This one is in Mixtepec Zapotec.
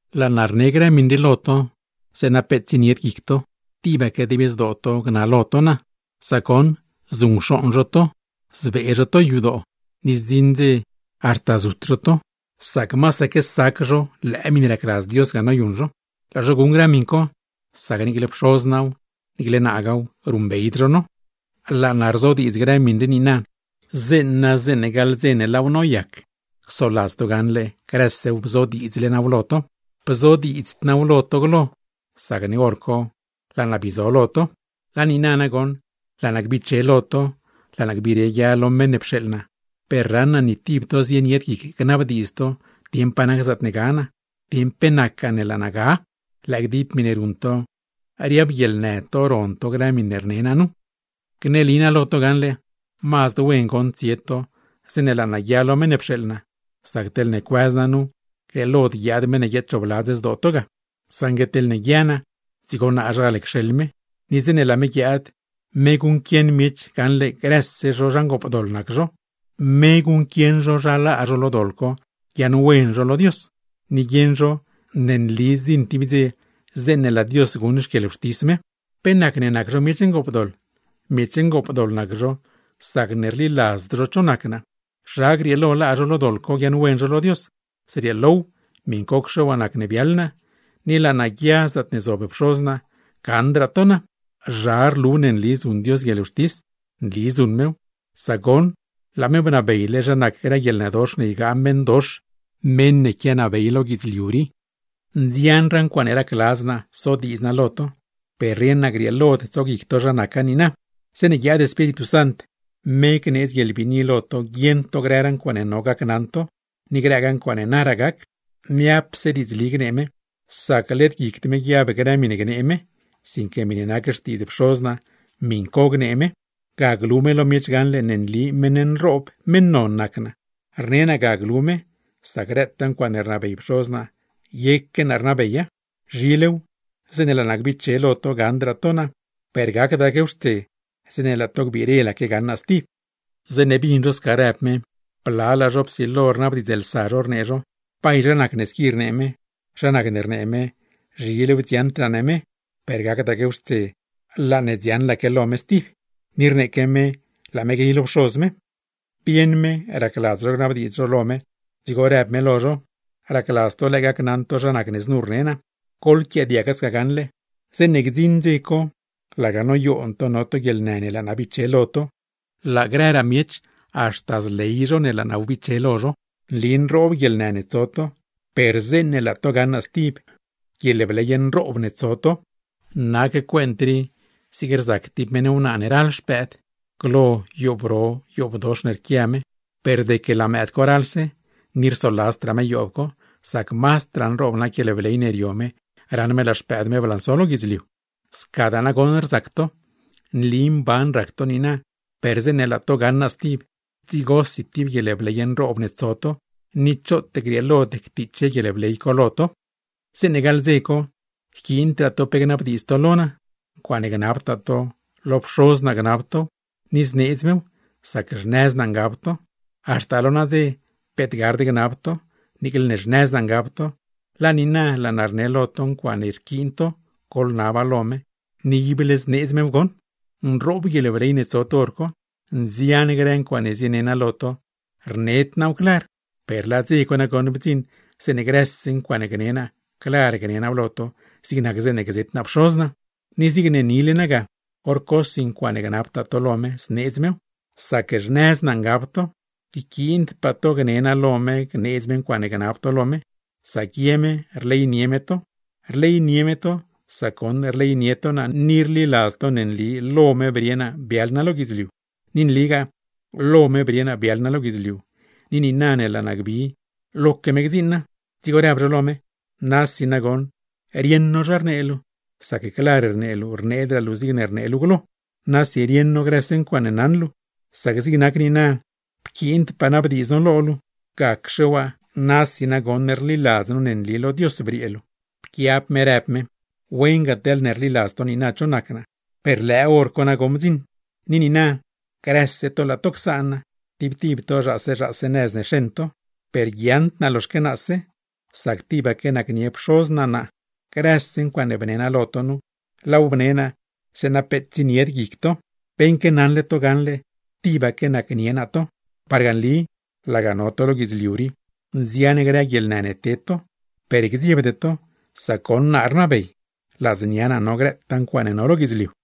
’Laa naa rne grë miṉ rii lo to zeeṉa peet tsienied guic to, tibaque dib zdoo to gnalo to naa. Sac goṉ zuṉcxooṉ zho to, zbee zho to yadoo; ni zdziṉ dze haxta zut zho to, sac masaque sac zho lëë miṉe racladz Dios ga noyuṉ zho. Laa zho guṉ grë miṉ co, sac niicle Pxoz naaw, niiclegaa naaw, ruṉbeyd zho no. ’Laa naa rzodiidz grë miṉ rii niina, zeeṉa zeeṉe gaḻ dze ne laaw noyac, csoladz to gaṉle grësew bzodiidzle naaw lo to. Bzodiidzd naaw lo to glo, sacne hor co laa naa bii zo lo to. Laa niina nagoṉ laa naa gbiche lo to, laa naa gbire guia lo meṉ ne pxeeḻ naa, per raṉ naa ni tib to zienied guic gnabdiidz dieṉ pa nac zaatne ga naa, dieṉ pe nacgaa ne laa naa ga. Lëë gdib miṉe ruṉ to, riab guieḻnë to ron to grë miṉe rne naa nu. ’Gneli naa lo to gaṉle: Mazd wen goṉ tsie to zeeṉe laa naa guia lo meṉ ne pxeeḻ naa, sac teḻne cuëz naa nu, grieelod guiaad meṉ ne guiadchoobladz zdoo to ga. Saṉgue teḻne guia naa, dzigo naazhal cxeḻ me. Ni zeeṉe laa me guiaad, me guṉquieṉ miech gaṉle grëse zho zha ngoopdoḻ nac zho, me guṉquieṉ zho zha laa zho lo doḻ co guiaaṉwen zho lo Dios, ni guieṉ zho ne nli zdziṉ tib dze zeeṉe laa Dios guṉ xquieḻwxtis me. ¿Pe nacne nac zho miech ngoopdoḻ? Miech ngoopdoḻ nac zho, sacne rliladzd zho cho nac naa. ¿Zha grieelo laa zho lo doḻ co guiaaṉwen zho lo Dios? Zrieelow, miṉcocxe waa nacne biaḻ naa, ni na laa naa guia zaatne zob Pxoz naa, gaṉdraa to naa. ¿Zha rlu ne nli zuṉ Dios guieḻwxtis? Nli zuṉ mew, sac goṉ laa me bnabeyle zha nac grë guieḻnëdox ne ygaa meṉdox, meṉ ne quianabey lo guidzliu rii. ’¡Nzianraa ncuaaṉe racladz naa sodiidz naa lo to! Per rieṉ naa grieelod tsoguic to zha naca niina. Zeeṉe guiaad Espíritu Sant, me gneedz guieḻbiini lo to guieṉ to grëraa ncuaaṉe no gacnaṉ to, ni grëgaa ncuaaṉe naraa gac. Niapse diidzli gnee me, sac led guicd me guiab grë miṉe gnee me, sinque miṉe nac xtiidz Pxoz naa, miṉ co gnee me. Ga glu me lo miech gaṉle ne nli meṉ nroob, meṉ non nac naa. Rne naa ga glu me, sac grëtaa ncuaaṉe rnabey Pxoz naa, yeque naa rnabeya. Zhilew zeeṉe laa naa gbiche lo to gaṉdraa to naa; per gacdaquew xtse zeeṉe laa to gbiirelaque gaṉ naa stib. Zeeṉe bdzion no sca rnee me, blalaa no psilo no rnabdiidzlsa no rnee no: ―¿Bay zha nacne squi rnee me? ¿Zha nacne rnee me, zhilew dziaṉdraa ne me, per gacdaquew xtse laa ne dziaṉlaque lo me stib? Ni rneeque me laa me guey lo Pxoz me. Bieṉ me racladz no gnabdiidz no lo me, dzigo në me lo no: ―¿Racladz to lëë gacnaṉ to zha nacne znu rne naa? Goḻquiaadiaga sca gaṉle: Zeeṉe gdziṉ dze co, laga noyoon to no to guieḻnë ne laa naa biche lo to, laa grëraa miech haxta zley zho ne laa naa wbiche lo zho. Nli nroob guieḻnë ne tso to, per zeeṉe laa to gaṉ naa stib, guieḻbley nroob ne tso to. Nac cuent rii zig rzac tib meṉ wnaa ne ral xpëëd. Glo yoob ro, yoobdox ne rquia me, per deque laa mëëd co ralse, ni rsoladzdraa me yoob co; sac mazdraa nroob nac guieḻbley ne rio me raṉ me laa xpëëd me blanso lo guidzliu. Scadaa nagoṉ rzac to, nli mban rac to niina, per zeeṉe laa to gaṉ naa stib, dzigosi tib guieḻbley nroob ne tso to, ni choot grieelod ctiche guieḻbley co lo to. ’Zeeṉe gaḻ dze co, yquiindraa to pe gnabdiidz to lo naa. Ncuaaṉe gnabtaa to, lo Pxoz naa gnab tow, ni zneedz mew, sac xnëz naa ngab to. Haxta lo nadze peet gard gnab to, niicle ne xnëz naa ngab to; laa niina laa naa rne lo to ncuaaṉe rquiin to goḻnaba lo me, ni ible zneedz mew goṉ. Nroob guieḻbley ne tso to hor co. Nzian grë ncuaaṉe zine naa lo to, rned naaw clar; per laa dze bdziṉ zeeṉe grëse ncuaaṉe gne naa, clar gne naaw lo to, zig nac zeeṉe gzet naa Pxoz naa. Ni zig nile naa ga, hor cosi ncuaaṉe gnabtaa to lo me, zneedz mew, sac xnëz naa ngab to. Yquiindpaa gne naa lo me gneedz me ncuaaṉe gnab to lo me, sac ye me rleynie me to. Rleynie me to, sac goṉ rleynie to naa ni rliladz to ne nli lo me brie naa biaḻ naa lo guidzliu. Ni nligaa, lo me brie naa biaḻ naa lo guidzliu; ni niina ne laa naa gbi, loque me gdziiṉ naa. Dzigo rdzieets no lo me: ―¡Nasi nagoṉ rieṉ no zha rnee luu! Sac clar rnee luu, rneedraa luu zigne rnee luu glo. Nasi rieṉ no grëse ncuaaṉe naṉ luu, sac zig nac niina pquiindpaa nabdiidz no lo luu. Gacxe waa, nasi nagoṉ rliladz no ne nli lo Dios briee luu. Pquiab me, në me: ―¡Wen ga teḻne rliladz to niina cho nac naa! Per lëë hor co nagoṉ bdziṉ; ni niina, grëse to laa to csaan naa, tib tib to zhaase zhaase nëz ne xeṉ to. Per guiaaṉd naa loxaque naase, sac tibaque nacnie Pxoz naa naa. Grëse ncuaaṉe bne naa lo to nu, laaw bne naa zeeṉa peet tsienied guic to, beṉque naṉle to gaṉle tibaque nacnie naa to. Parga nli, laga no to lo guidzliu rii, nzian grë guieḻnë ne ted to, per gdziebde to; sac goṉ naa rnabey, ladznia naa no grëtaa ncuaaṉe no lo guidzliu.